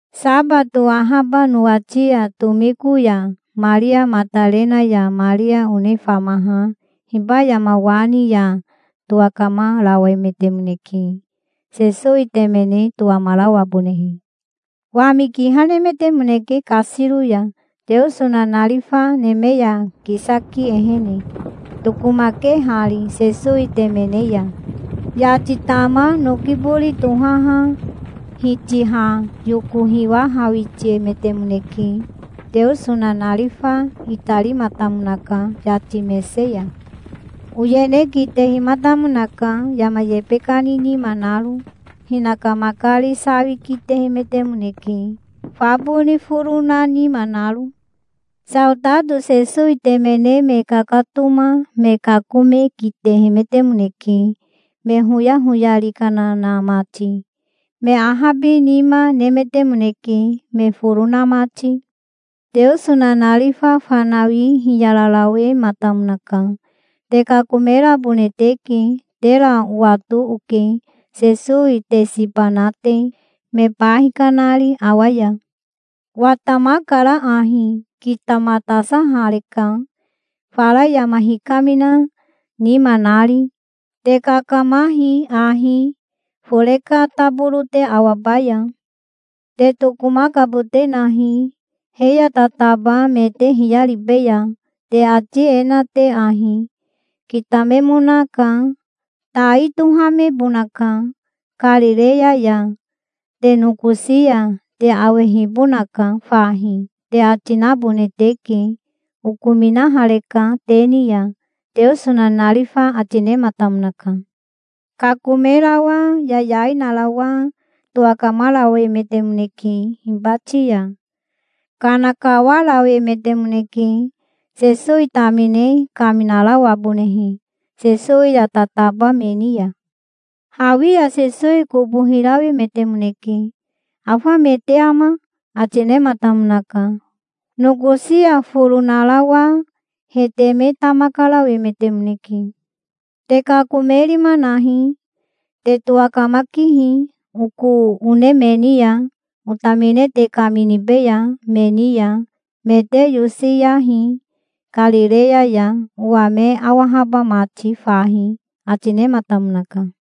Sabato ahaba nowati ya tomiko ya Maria Matarena ya Maria one famaha hiba yama wa ni ya towakamarawemetemoneke, Sesowi temene towamarawabonehe. Wami kiha nemetemoneke kasiro ya, Teoso nanarifa neme ya kisaki ehene, tokomakehari Sesowi temene ya. Yati tama noki bori tohaha hitiha yoko hiwahawitiemetemoneke. Teoso nanarifa itarimatamonaka yati mese ya. Oyene kitehimatamonaka, yama yebe kani nima naro. Hinaka makari sawi kitehemetemoneke, fa boni foro na nima naro. Saotato Sesowi temene me kakatoma me kakome kitehemetemoneke, me hoyahoyari kana na mati. Me ahabinima nemetemoneke, me foro na mati. Teoso nanarifa fanawi hiyararawematamonaka. "Te kakomerabone teke. Tera owato oke, Sesowi te siba na te, me ba hikanari awa ya. Watamakara ahi. Kitamatasahareka, fara yama hikamina nima nari. Te kakamahi ahi, fore ka taboro te awabaya. Te tokomakabote nahi, he ya tataba me te hiyaribeya, te ati e na te ahi: 'Kitamenoka. Tai tohamebonaka Karireya ya, te nokosi ya. Te awehibonaka fahi', te ati nabone teke. Okominahareka te ni ya", Teoso nanarifa ati nematamonaka. Kakomerawa yayai narawa towakamarawemetemoneke hibati ya. Kana kawarawemetemoneke, Sesowi tamine kaminarawabonehe Sesowi ya tataba me ni ya. Hawi ya Sesowi kobo hirawemetemoneke. "Afa me te ama?" ati nematamonaka. Nokosi ya foro narawa he teme tama karawemetemoneke. "Te kakomerima nahi. Te towakamakihi oko one me ni ya, otamine te kaminibeya me ni ya. Me te yosiyahi Karireya ya, owa me awahaba mati fahi", ati nematamonaka.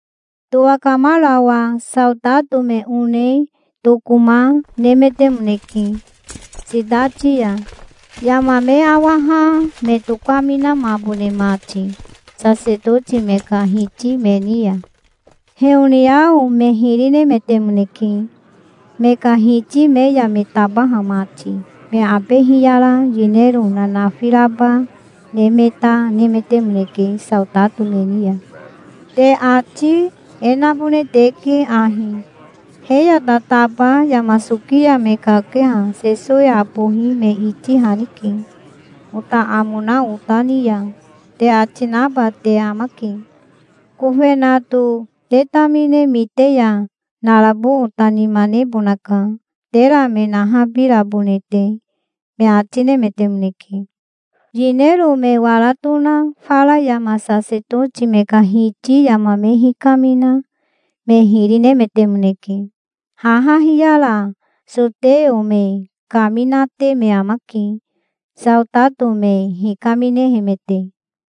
Towakamarawa saotato me one tokoma nemetemoneke sitati ya, yama me awaha me tokaminamabone mati sasetoti me ka hiti me ni ya. Heoniao me hiri nemetemoneke, me ka hiti me ya me tabaha mati. Me abe hiyara yinero nanafi raba ne me ta nemetemoneke saotato me ni ya. "Te ati e nabone teke ahi: 'He ya tataba yama soki ya me kakeha Sesowi abohi me itihanike, ota amo na ota ni ya', te ati naba te amake. Kofenato te tamine mite ya narabo ota nima nebonaka, tera me nahabirabone te", me ati nemetemoneke. Yinero me wara tona fara yama sasetoti me ka hiti yama me hikamina me hiri nemetemoneke. Haha hiyara soteo me kaminate me amake, saotato me hikaminehemete.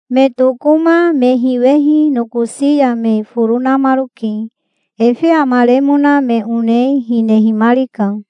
Me tokoma me hiwehi nokosi ya me foro namaroke. Efe amaremona me one hinehimarika.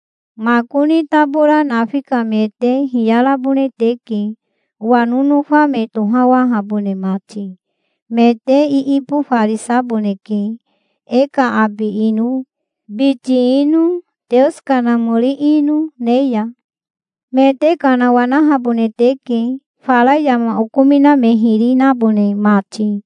Makoni tabora nafi ka me te hiyarabone teke, owa nonofa me tohawahabone mati. Me te iibofarisaboneke, e ka abi ino, biti ino, Teoso Kanamori ino ne ya. Me te kanawanahabone teke, fara yama okomina me hiri nabone mati.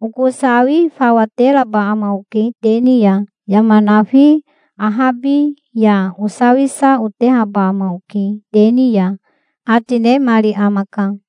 Oko sawi fawa teraba ama oke te ni ya. Yama nafi ahabi ya osawisa otehaba ama oke te ni ya", ati nemari amaka.